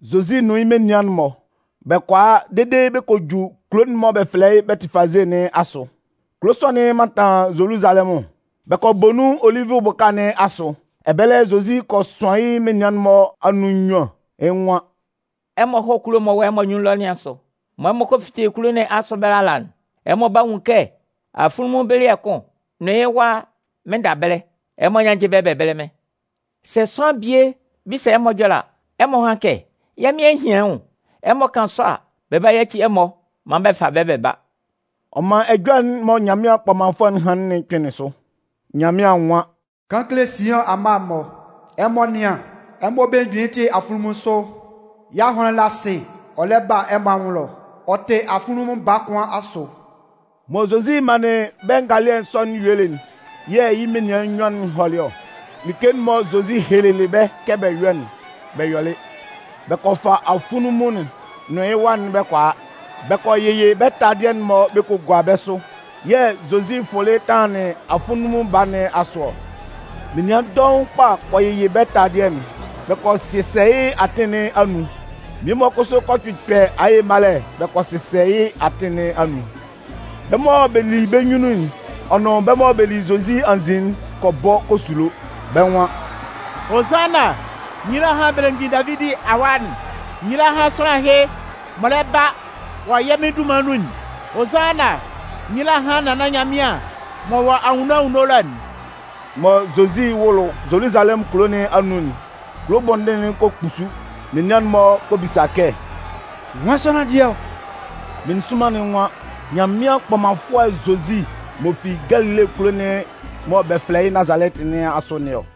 Zozi nʋn yɩ́ menian'n-mɔ, bɛ kɔ a dede bɛ kɔ ju kulo'n mɔ bɛ fɛlɛ yɩ́ Bɛtɩfaze nɩn asʋ. Kulo sɔ'n mantan Zoluzalɛmʋn. Bɛ kɔ bɔ nun Olivʋ bʋka nɩn asʋ. Ɛbɛlɛ, Zozi kɔ sʋan yɩ́ menian'n-mɔ anun nnyuan, yɩ́ nwan: “Ɛmɔ hɔ́ kulo'n m'ɔ wɔ ɛmɔ anyunnun ɛlɔ nɩn asʋ. Mɔ ɛmɔ 'fite kulo nɩn asʋ ɛbɛlɛ ala'n, ɛmɔ 'ba nwun kɛ afunlunmun bɩlɩɛ kʋn nʋn yɩ́ wa mɩnnda ɛbɛlɛ. Ɛmɔ nyánnjɩ bɛ́ bɛ bɛ́lɛ mɩ́n. Sɛ sʋanlan bie bisa ɛmɔ ɛjɔlɛ a, ɛmɔ hán kɛ: ‘Yɛ́ Mɩn a hian yɩ́ nwʋn.’ Ɛmɔ kan sɔ a, bɛ 'ba yaci ɛmɔ maan bɛ fa bɛ́ bɛ ba.” Ɔ man ɛjɔlɛ'n mɔ Nyanmɩan kpɔmanfʋɛ'n hanlɩn'n kpɩnlɩn sʋ: Nyanmɩan nwan: Kan kele Siʋn amma'n-mɔ, ɛmɔ nɩ́an, ɛmɔ belemgbin'n tɩ afunlunmun sʋ. Yɩ́ ahʋnlɩn la asɩ ɔ lɛ ba ɛmɔ anwʋn ɛlɔ ɔ tɩ afunlunmun baa kʋn asʋ. Mɔ Zozi manlɩn bɛ́ ngalɩɛ sɔ'n yuelɩ'n, yɛ̂ yɩ́ menian nnyuan'n hɔlɩ ɔ. Like'n mɔ Zozi helelɩ bɛ́ kɛ bɛ yɔ́'n, bɛ yɔlɩ. Bɛ kɔ fa afunlunmun'n nʋn yɩ́ wa'n bɛ kɔ a. Bɛ kɔ yɩyɩ bɛ́ taladɩɛ'n-mɔ bɛ kɔ gua bɛ́ sʋ, yɛ̂ Zozi fʋlɩ tanlanlɩn afunlunmun baa nɩn asʋ ɔ. Menian dɔʋn kpa kɔ yɩyɩ bɛ́ taladɩɛ'n bɛ kɔ sɩsɛ yɩ́ atɩn nɩn anun. Mmie-mɔ kʋsʋ kɔ kpɩkpɛ aye malɛ bɛ kɔ sɩsɛ yɩ́ atɩn nɩn anun. Bɛ́ mɔ bɛ li bɛ́ nyunnun'n ɔ nʋn bɛ́ mɔ bɛ li Zozi anzin'n kɔ bɔ kɔ sulo. Bɛ́ nwan: “Hozanna! Nyila hán belemgbin Davidi Awa'n! Nyila hán sʋanlan ɛhɩ m'ɔ lɛ ba wɔ yɛ́ Mɩn dunman nun'n! Hozanna! Nyila hán Nannan Nyanmɩan m'ɔ wɔ anwunno anwunno ɛlɔ'n!” Mɔ Zozi 'wʋlʋ Zoluzalɛmʋn kulo nɩn anun'n, kulo bɔndɩn'n kɔ kpusu. Menian'n-mɔ kɔ bisa kɛ: “Nwan sʋanlan dɩɛ ɔ?” Meninsʋnman'n nwan: “Nyanmɩan kpɔmanfʋɛ Zozi m'ɔ fi Galile kulo'n mɔ bɛ fɛlɛ yɩ́ Nazalɛtɩ nɩn asʋ nɩn ɔ.”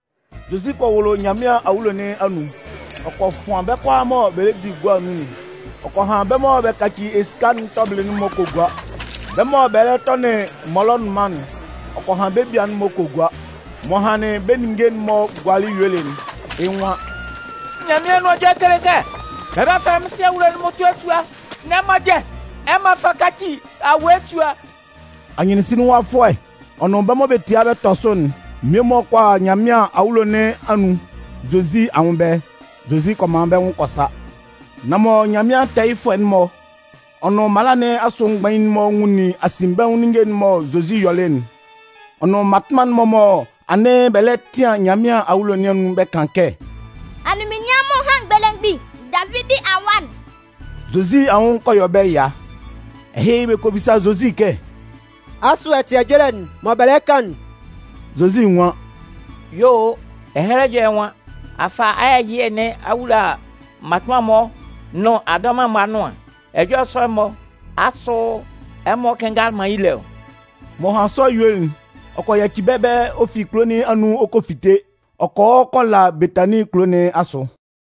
Zozi kɔ wʋlʋ Nyanmɩan awulo nɩn anun, ɔ kɔ fʋan bɛ́ kʋalaa mɔ bɛ lɛ di gua nun'n. Ɔ kɔ han bɛ́ mɔ bɛ kaci esika'n tɔbɩlɩ'n-mɔ kɔ gua. Bɛ mɔ bɛ lɛ tɔnɩn mɔlɔnʋnman'n, ɔ kɔ han bɛ́ bia'n-mɔ kɔ gua. M'ɔ hanlɩn bɛ́ ninnge'n-mɔ gualɩ yuelɩ'n, yɩ́ nwan: “Nyanmɩan Anʋan Ɛjɔlɛ'n lɛ kele kɛ: Bɛ 'ba fɛlɛ mɩ́n sua'n mmʋtʋɛ sua. Nan ɛmɔ dɩɛ, ɛmɔ a fa a kaci awue sua!” Anyɩnsinlinwafʋɛ, ɔ nʋn bɛ́ mɔ bɛ tia bɛ tɔ sʋ'n mmie-mɔ kɔ a Nyanmɩan awulo nɩn anun, Zozi anwʋn ɛbɛlɛ. Zozi kɔ man bɛ́ nwʋn kɔ sa. Nan mɔ Nyanmɩan tɛɛyɩfʋɛ'n-mɔ, ɔ nʋn mala nɩn asʋ mgbain'n-mɔ nwunlin asinbɛnwʋn ninnge'n mɔ Zozi yɔlɩ'n, ɔ nʋn mmatʋnman'n-mɔ mɔ anɩn bɛ lɛ tɩan Nyanmɩan awulo nɩn anun bɛ́ kan kɛ: “Anunminnyanmʋn hán belemgbin Davidi Awa'n!”, Zozi anwʋn kɔ yɔ bɛ́ ɛya. Ɛhɩ, bɛ kɔ bisa Zozi kɛ: “Asʋ ɛ tɩ ɛjɔlɛ'n mɔ bɛ lɛ kan'n?” Zozi nwan: “Yuo o. Ɛhɛlɛ Ɛjɔlɛ nwan: A fa ayɛ ɛyɩɛ nɩn a wula mmatʋnman'n-mɔ nʋn adɔman'n-mɔ anʋan. Ɛjɔlɛ sɔ'n-mɔ, asʋ ɛmɔ kɩnngalɩ man yɩ́ lé ɔ?” M'ɔ hanlɩn sɔ yuelɩ'n, ɔ kɔ yaci bɛ́ ɛbɛlɛ ɔ fi kulo nɩn anun ɔ kɔ fite ɔ kɔ hɔ kɔ la Betanin kulo nɩn asʋ.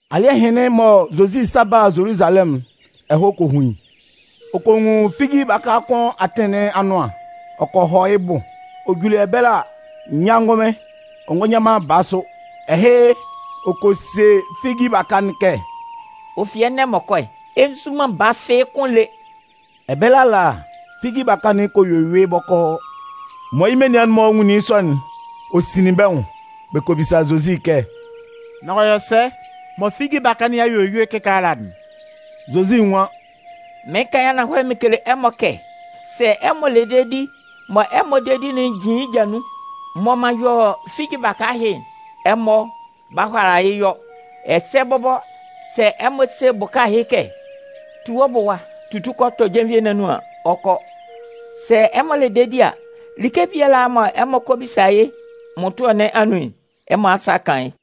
Alɩ́ɛ hɩnlɩn mɔ Zozi 'sa ba Zoluzalɛmʋn'n, ɛhɔɛ kɔ hun yɩ́. Ɔ kɔ nwun figi baka kʋn atɩn nɩn anʋan, ɔ kɔ hɔ yɩ́ bʋ. Ɔ juli ɛbɛlɛ a, nyâ ngʋnmɩn, ɔ ngɔ nyan baa sʋ. Ɛhɩ, ɔ kɔ se figi baka'n kɛ: “Ɔ fi ɛnɛ m'ɔ kɔ'n, ɛ nzu man baa fɩ́ɩ́ kʋ́n lé.” Ɛbɛlɛ ala, figi baka'n kɔ yue yʋɩ bɔkɔɔ. Mɔ yɩ́ menian'n-mɔ nwunlin yɩ́ sɔ'n, ɔ sinlin bɛ́ nwʋn. Bɛ kɔ bisa Zozi kɛ: “Nan ɔ yɔ sɛ mɔ figi baka nɩn a yue yʋɩ kɩkaala'n?” Zozi nwan: “Mɩɩn kan yɩ́ ananhɔlɛ mɩn kele ɛmɔ kɛ sɛ ɛmɔ le dedi mɔ ɛmɔ dedi'n jin yɩ́ ja nun'n, mɔ m'an yɔ figi baka ɛhɩ'n, ɛmɔ 'ba hʋala yɩ́ yɔ, ɛsɛ bɔbɔ sɛ ɛmɔ se bʋka ɛhɩ kɛ: ‘Tu wɔ́ bʋ ɛwa, tutu kɔ tɔ jenvie nɩn anun’ an, ɔ 'kɔ. Sɛ ɛmɔ le dedi a, like biala mɔ ɛmɔ kɔ bisa yɩ́ mmʋtʋɛ nɩn anun'n, ɛmɔ asa 'kan yɩ́.”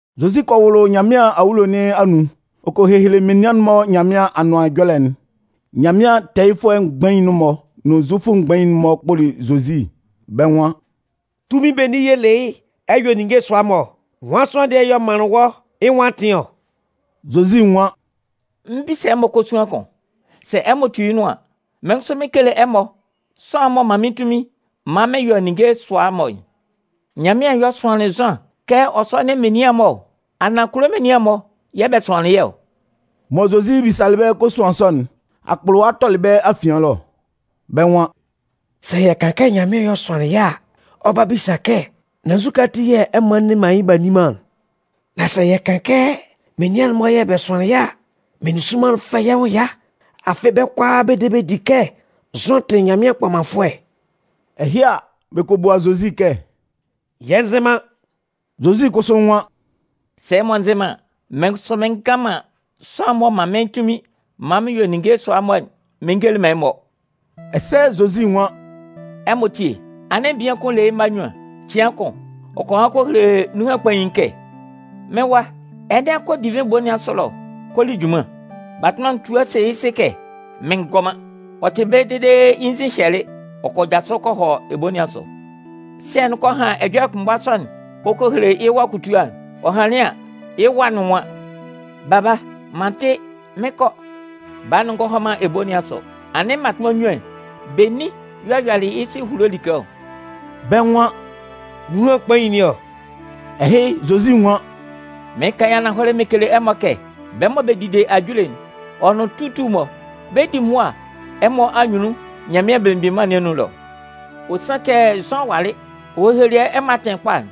Zozi kɔ wʋlʋ Nyanmɩan awulo nɩn anun, ɔ kɔ hehele menian'n-mɔ Nyanmɩan Anʋan Ɛjɔlɛ'n. Nyanmɩan tɛɛyɩfʋɛ mgbain'n-mɔ nʋn Zufʋ mgbain'n-mɔ kpʋlɩ Zozi, bɛ́ nwan: “Tunmin benin yɛ̂ ɛ le yɩ́ ɛ yɔ ninnge sʋa-mɔ ɔ? Nwan sʋanlan dɩɛ y'ɔ manlɩn wɔ́ yɩ́ nwʋn atɩn ɔ?” Zozi nwan: “Mɩn 'bisa ɛmɔ kosuan kʋn. Sɛ ɛmɔ tu yɩ́ nʋan an, mɩ́n kʋsʋ mɩn 'kele ɛmɔ sʋanlan'n m'ɔ man mɩ́n tunmin maan mɩn yɔ ninnge sʋa-mɔ'n. Nyanmɩan y'ɔ sʋanlɩn Zʋan kɛ ɔ sɔ́nɩn menian'n-mɔ ɔ, anaan kulo menian'n-mɔ yɛ̂ bɛ sʋanlɩn yɩ́ ɔ?” Mɔ Zozi bisalɩ bɛ́ kosuan sɔ'n, akpʋlʋwa tɔlɩ bɛ́ afian ɛlɔ. Bɛ́ nwan: “Sɛ yɛ kan kɛ Nyanmɩan yɛ̂ ɔ sʋanlɩn yɩ́ a, ɔ 'ba bisa yɛ́ kɛ: ‘Nan nzukɛ ati yɛ̂ ɛmɔ a nne man yɩ́ b'a nni man'n?’ Nan sɛ yɛ kan kɛ: ‘Menian'n-mɔ yɛ̂ bɛ sʋanlan yɩ́’ a, meninsʋnman'n 'fɛ yɛ́ nwʋn ɛya. Afɩ bɛ́ kʋalaa bɛ de bɛ di kɛ Zʋan tɩ Nyanmɩan kpɔmanfʋɛ.” Ɛhɩ a, bɛ kɔ bua Zozi kɛ: “Yɛ nzɩ man.” Zozi kʋsʋ nwan: “Sɛ ɛmɔ nzɩ man an, mɩ́n kʋsʋ mɩn ngan man sʋanlan'n m'ɔ man mɩ́n tunmin maan mɩn yɔ ninnge sɔ'n-mɔ'n mɩn ngele man ɛmɔ.” Ɛsɛ Zozi nwan: “Ɛmɔ tíe. Anɩn bian kʋn le yɩ́ mma nnyuan. Cɩan kʋn, ɔ kɔ han kɔ hele nunhan kpain'n kɛ: ‘Mɩ́n wa, ɛnɛ, kɔ divɩn ebo nɩn asʋ ɛlɔ kɔ li junman.’ “Batʋnman'n tua se yɩ́ sɩ kɛ: ‘Mɩn ngɔ man.’ Ɔ tɩ ɛbɛlɛ dede yɩ́ nzin hyɛlɩ, ɔ kɔ jasʋ ɔ kɔ hɔ ebo nɩn asʋ. “Sɩɛ'n kɔ han ɛjɔlɛ kʋnmgba sɔ'n ɔ kɔ hele yɩ́ wa kutua'n. Ɔ hanlɩn an, yɩ́ wa'n nwan: ‘Baba, m'an tɩ, mɩn 'kɔ.’ Baa'n ngɔ hɔ man ebo nɩn asʋ. “Anɩn mmatʋnman nnyuan'n, benin y'ɔ yɔlɩ yɩ́ sɩ ehulo like ɔ?” Bɛ́ nwan: “Nunhan kpain nɩn ɔ.” Ɛhɩ, Zozi nwan: “Mɩɩn kan yɩ́ ananhɔlɛ mɩn kele ɛmɔ kɛ, bɛ́ mɔ bɛ dide ajule'n, ɔ nʋn tutu'n-mɔ, bɛ 'di mʋa ɛmɔ anyunnun Nyanmɩan Belemgbin Mân nɩn anun ɛlɔ. Ɔ sanlɩn kɛ Zʋan walɩ, ɔ helelɩ ɛmɔ atɩn kpa'n,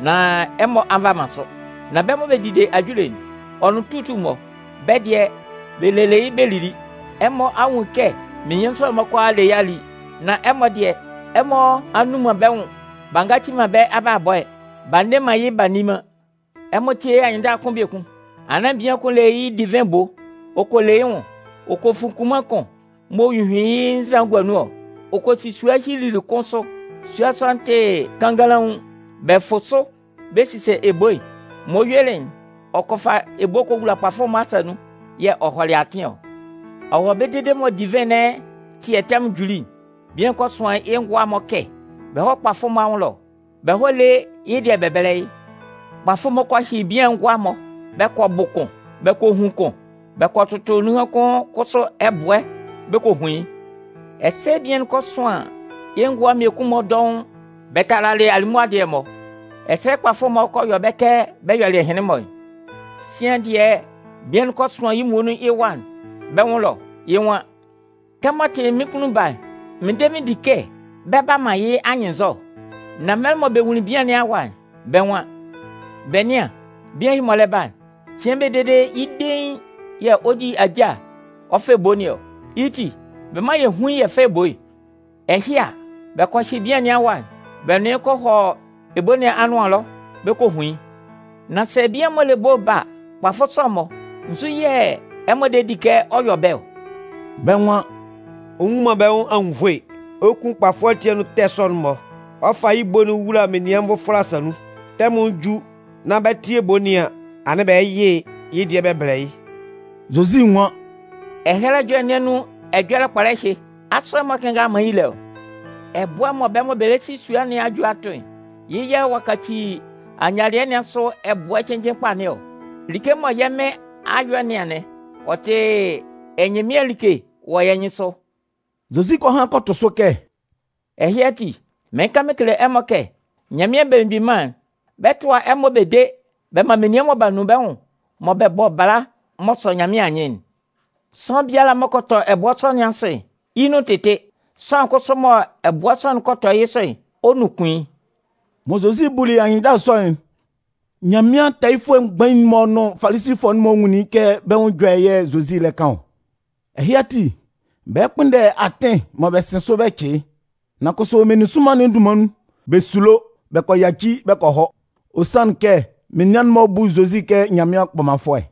nan ɛmɔ a nva man sʋ. Nan bɛ́ mɔ bɛ dide ajule'n, ɔ nʋn tutu'n-mɔ, bɛ́ dɩɛ, bɛ lelɩ yɩ́ bɛ lili. Ɛmɔ a nwun kɛ menian sɔ'n-mɔ kʋalaa a le yɩ́ a li. Nan ɛmɔ dɩɛ, ɛmɔ a nnun man bɛ́ nwʋn b'a ngaci man bɛ́ abalabɔ'n, b'a nne man yɩ́ b'a nni man.” “Ɛmɔ tíe anyɩnndala kʋn biekun. Anɩn bian kʋn le yɩ́ divɩn ebo. Ɔ kɔ le yɩ́ nwʋn. Ɔ kɔ fun kunman kʋn m'ɔ hyuhyuin yɩ́ nzan'n gua nun ɔ. Ɔ kɔ si sua hyilili kʋn sʋ. Sua sɔ'n tɩ kannganlaun. Bɛ fʋ sʋ bɛ sisa ebo'n. M'ɔ yuelɩ'n, ɔ kɔ fa ebo'n kɔ wula kpafʋ-mɔ asa nun. Yɛ̂ ɔ hɔlɩ yɩ́ atɩn ɔ. Ɔ wɔ ɛbɛlɛ dede mɔ divɩn nɩn ɛtɩɛ'n tɛmʋn juli'n, bian'n kɔ sʋan yɩ́ ngʋa'n-mɔ kɛ bɛ hɔ́ kpafʋ'n-mɔ anwʋn ɛlɔ, bɛ hɔ́ lé yɩ́ dɩɛ'n bɛ bɛ́lɛ yɩ́. “Kpafʋ'n-mɔ kɔ hyɩ bian'n ngʋa'n-mɔ bɛ kɔ bʋ kʋn, bɛ kɔ hun kʋn, bɛ kɔ tʋtʋ nunhan kʋn kʋsʋ ɛbʋɛ bɛ kɔ hun yɩ́. Ɛsɛ bian'n kɔ sʋan yɩ́ ngʋa'n mmiekun-mɔ dɔʋn bɛ talalɩ alimʋa dɩɛ'n-mɔ. Ɛsɛ kpafʋ-mɔ kɔ yɔ bɛ́ kɛ bɛ yɔlɩ ɛhɩnlɩn-mɔ'n. Sian dɩɛ, bian'n kɔ sʋan yɩ́ muonun yɩ́ wa'n bɛ́ nwʋn ɛlɔ. Yɩ́ nwan: ‘Kɛmɔ ɔ tɩ mɩ́n kunnun baa'n, mɩn de mɩn di kɛ bɛ 'ba man yɩ́ anyɩnnzɔ.’ “Nan mɛlɛ mɔ bɛ nwunlin bian nɩn awa'n, bɛ́ nwan: ‘Bɛ nɩ́an, bian ɛhɩ m'ɔ lɛ ba'n, cɩan bie dede yɩ́ dein yɛ̂ ɔ 'di ajâ'n ɔ fa ebo nɩn ɔ. Yɩ́ ti, bɛ mán yɛ hún yɩ́ yɛ fá ebo'n.’ Ɛhɩ a, bɛ kɔ hyɩ bian nɩn awa'n bɛ nʋn yɩ́ kɔ hɔ ebo nɩn anʋan ɛlɔ bɛ kɔ hun yɩ́. “Nan sɛ bian'n m'ɔ le ebo'n ba a, kpafʋ sɔ'n-mɔ, nzu yɛ̂ ɛmɔ de di kɛ ɔ 'yɔ bɛ́ ɔ?” Bɛ́ nwan: “Ɔ nnwun man bɛ́ nwʋn anwunnvoe, ɔ 'kun kpafʋ ati anun ɛtɛ sɔ'n-mɔ ɔ fa yɩ́ ebo'n wula menian nvʋfɔlɛ asa nun. Tɛmʋn'n ju nán bɛ 'tɩ ebo nɩn an, anɩn bɛ yɩ yɩ́ dɩɛ bɛ bɛlɛ yɩ́.” Zozi nwan: “Ɛhɛlɛ Ɛjɔlɛ nɩn anun ɛjɔlɛ kpɔlɛ ɛhɩ, asʋ ɛmɔ kɩnngalɩ man yɩ́ lé ɔ? Ɛbʋɛ'n mɔ bɛ́ mɔ bɛ lɛ si sua nɩn a ju a tʋ'n, yɩ́ yɛ̂ ɔ'a kaci ayialɩɛ nɩn asʋ ɛbʋɛ cɩnnjɩn kpa nɩn ɔ. Like mɔ yɛ́ Mɩn a yɔ nɩn anɩn. Ɔ tɩ ɛnyɩnmɩan like wɔ yɛ́ nyɩnsʋ!” Zozi kɔ han kɔ tʋ sʋ kɛ: “Ɛhɩ ati, mɩɩn kan mɩn kele ɛmɔ kɛ Nyanmɩan Belemgbin Mân'n, bɛ 'tʋa ɛmɔ bɛ de bɛ man menian mɔ b'a nun bɛ́ nwʋn mɔ bɛ bɔ bala m'ɔ sɔ Nyanmɩan anyɩn'n. [ Sʋanlan biala m'ɔ kɔ tɔ ɛbʋɛ sɔ nɩn asʋ'n, yɩ́ nun 'tɩtɩ. Sʋanlan kʋsʋ mɔ ɛbʋɛ sɔ'n kɔ tɔ yɩ́ sʋ'n, ɔ 'nunkun yɩ́.”] Mɔ Zozi buli anyɩnndala sɔ'n, Nyanmɩan tɛɛyɩfʋɛ mgbain'n-mɔ nʋn Falisifʋɛ'n-mɔ nwunlin kɛ bɛ́ nwʋn ɛjɔlɛ yɛ̂ Zozi lɛ kan ɔ. Ɛhɩ ati, bɛ kpʋnndɛlɩ atɩn mɔ bɛ 'sɩn sʋ bɛ cɩ yɩ́. Nan kʋsʋ, meninsʋnman'n dunman nun, bɛ sulo, bɛ kɔ yaci bɛ kɔ hɔ. Ɔ sanlɩn kɛ menian'n-mɔ bu Zozi kɛ Nyanmɩan kpɔmanfʋɛ.